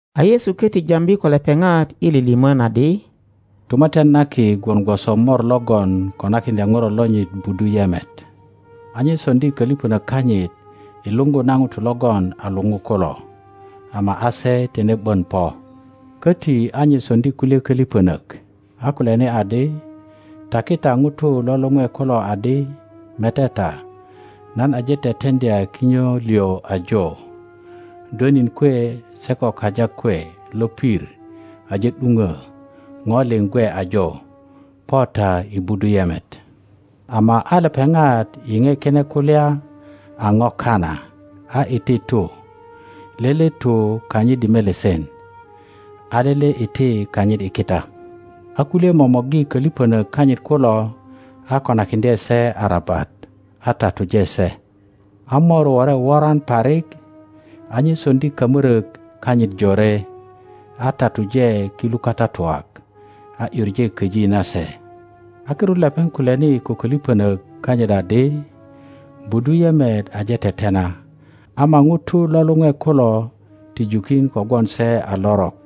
A Yesu köti jambi ko lepeŋat i lilimön adi, Tumatyan na Ki gwon gwoso mor logon konakiŋdya ŋuro lonyit budu yemet. A nye soŋdi kölipönök kanyit i luŋgu na ŋutu logon a luŋu kulo, ama a se tine ’bön po. Köti a nye soŋdi kulye kölipönök, a kulyani adi, Taki ta ŋutu lo luŋwe kulu adi, Mete ta, nan aje teteŋdya kinyo liŋ ajo, dwönin kwe se ko kaja kwe lopir aje ’duŋö, ŋo liŋ gwe ajo. Po ta i budu yemet. Ama a lepeŋat yiŋe kine kulya a ŋo kana, a iti tu, lele tu kanyit i melesen, a lele iti kanyit i kita. A kulye momorgi kölipönök kanyit kulo, a konakiŋdye se arabat, a tatuje se. A mowore woran parik; a nye soŋdi kamörök kanyit jore, a tatuje kilu katatuak, a ’yuŋe köji nase. A kirut lepeŋ kulyani ko kölipönök kanyit adi, Budu yemet aje tetena, ama ŋutu lo luŋwe kulo ti jukin kogwon se a lorok.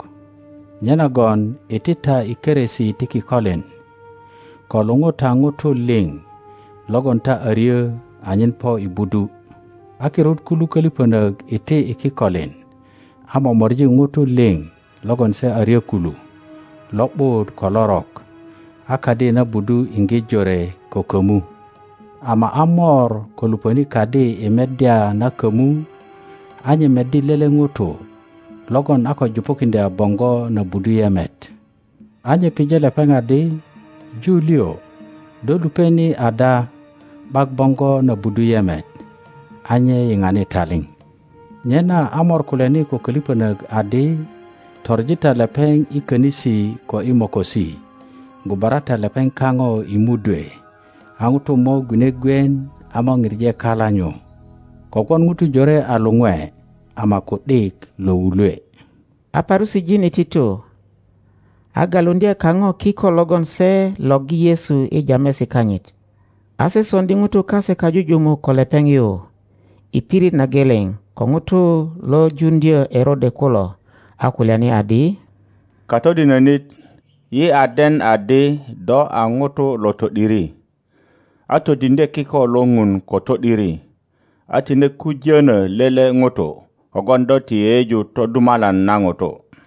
Nyenagon iti ta i keresi ti kikolin ko luŋu ta ŋutu liŋ logon ta a ryö anyen po i budu. A kirut kulu kölipönök iti i kikolin a momori ŋutu liŋ logon se a ryö kulu, lo ’but ko lorok; a kadi na budu iŋge jore ko kömu. Ama a mor ko lupöni kadi i meddya na kömu, a nye meddi lele ŋuto logon a ko jupukiŋdya boŋgo na budu yemet. A nye pije lepeŋ. adi, Ju liŋ, do lupe ni ada ’bak boŋgo na budu yemet? A nye yiŋani talip. Nyena a mor kulyani ko kölipönök adi, Toŋi ta lepeŋ. i könisi ko i mokosi, gubara ta lepeŋ. kapo i mudwe. A ŋutu mo gwine gwien a mo pije kala nyu. Kogwon ŋutu jore a luŋwe, ama ku ’dik lo wulwe. A Parusijin iti tu, a galuŋdye kapo kiko logon se lorgi Yesu i jamesi kanyit. A se soŋdi ŋutu kase kajujumuk ko lepeŋ. yu i pirit na geleŋ ko ŋutu lo juŋdyö Erode kulo, a kulyani adi, Katodinönit, yi a den adi do a ŋuto lo to ’diri, a todiŋdye kiko lo Ŋun ko to ’diri, a tine kujönö lele ŋuto, kogwon do ti yeyeju todumalan na ŋutu.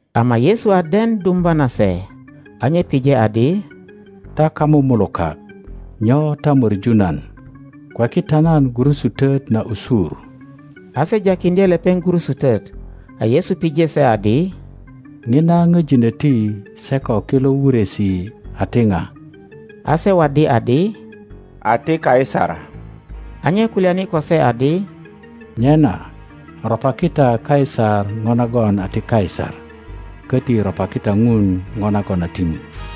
Ama Yesu a den dumba nase, a nye pije adi, Ta kamumulukak, nyo ta möŋu nan? Kweki ta nan gurusutöt n ’a usur. A se jakiŋdye lepeŋ gurusutöt, a Yesu pije se adi, pöjinöti se ko kilo wuresi a ti pa? A se waddi adi, A ti Kaisar. A nye kulyani ko se adi, Nyena ropaki ta Kaisar po nagon a ti Kaisar, köti ropaki ta ŋun po nagon a ti Ŋun.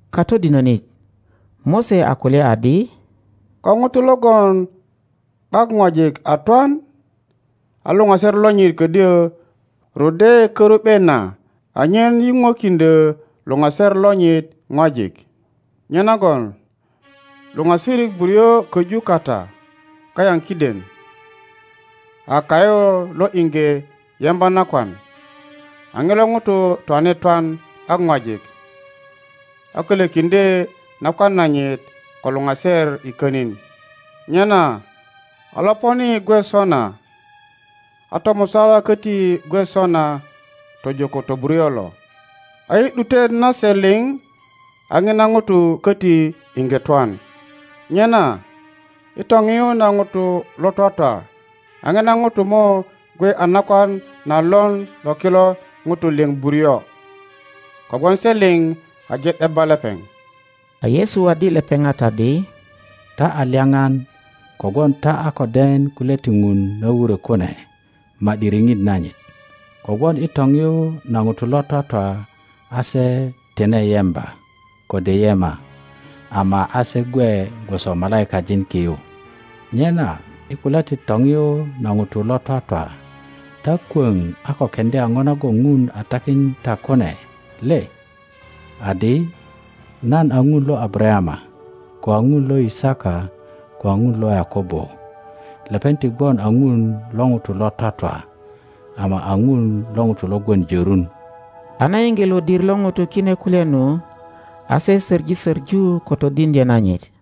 Katodinönit, Mose a kulya adi, ko ŋuto logon ’bak ŋwajik a twan, a luŋaser lonyit ködyö ruddye karu ’be na anyen yuŋwekiŋdyö luŋaser lonyit ŋwajik. Nyenagon luŋasirik buryo köju kata kayaŋ kiden. A kayu lo iŋge yemba nakwan, a ŋilo ŋuto twane twan ’bak ŋwajik, a kölökiŋdye nakwan nanyit ko luŋaser i könin. Nyena a loponi gwe sona, a tomusala köti gwe sona tojo ko toburyo lo. A i ’dutet na se liŋ a ŋina ŋuto köti iŋge twan. Nyena i topiyu na ŋutu lo twatwa a ŋina ŋuto mo gwe a nakwan na lon lo kilo ŋutu liŋ buryo? Kogwon se liŋ aje ’debba lepeŋ. A Yesu waddi lepeŋat adi, Ta a lyaŋan kogwon ta a ko den kulya ti Ŋun na wurö kune ma ’di riŋit nanyit. Kogwon i topiyu na ŋutu lo twatwa, a se tine yemba, kode yema, ama a se gwe gwoso malaikajin ki yu. Nyena i kulya ti topiyu na ŋutu lo twatwa, ta kwöŋ a ko keŋdya po nagon Ŋun a takin ta kune le? Adi, Nan a Ŋun lo Abarayama, ko a Ŋun lo Yisaka, ko a Ŋun lo Yakobo. Lepeŋ ti gwon a Ŋun lo ŋutu lo twatwa, ama a Ŋun lo ŋutu lo gwon jörun. a na yiŋge lodir lo ŋutu kine kulya nu, a se söŋi söŋu ko todiŋdyö nanyit.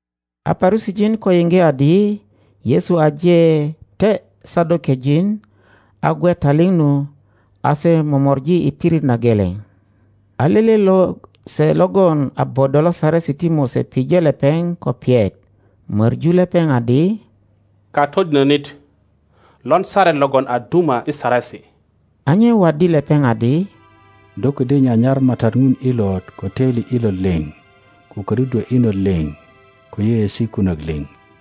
A Parusijin ko yiŋge adi Yesu aje te Sadokejin a gwe taliŋ nu, a se momor ji i pirit na geleŋ. A lele lose logon a bodo lo Saresi ti Mose pije lepeŋ ko piyet, möŋu lepeŋ adi, Katodinönit, lon saret logon a duma i saresi? A nye waddi lepeŋ. adi, Do ködyö nyanyar MATAT Ŋun ilot ko töili ilot liŋ, ko ködudwö inot liŋ, ko yeyeesi kunök liŋ.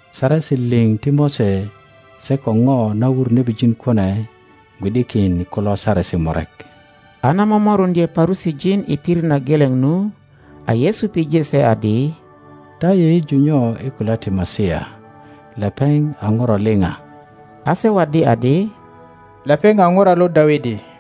Saresi liŋ ti Mose se ko po na wur nebijin kune gwi ’dikin i kulo saresi murek. A na momoruŋdye Parusijin i pirit na geleŋ nu, a Yesu pije se adi, Ta yeyeju nyo i kulya ti Masia, lepeŋ a ŋuro liŋ a? A se waddi adi, Lepeŋ a ŋuro lo Dawidi.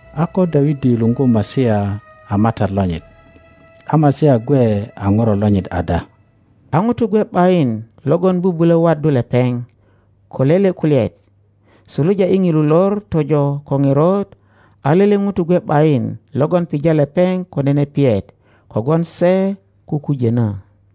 A ko Dawidi luŋgu Masia a MATAT lonyit, a Masia gwe a ŋuro lonyit ada? A ŋuto gwe ’bayin logon bubulö waddu lepeŋ ko lele kulyaet; suluja i ŋilu lor tojo ko ŋerot a lele ŋuto gwe ’bayin logon pija lepeŋ ko nene piyet kogwon se kukujönö.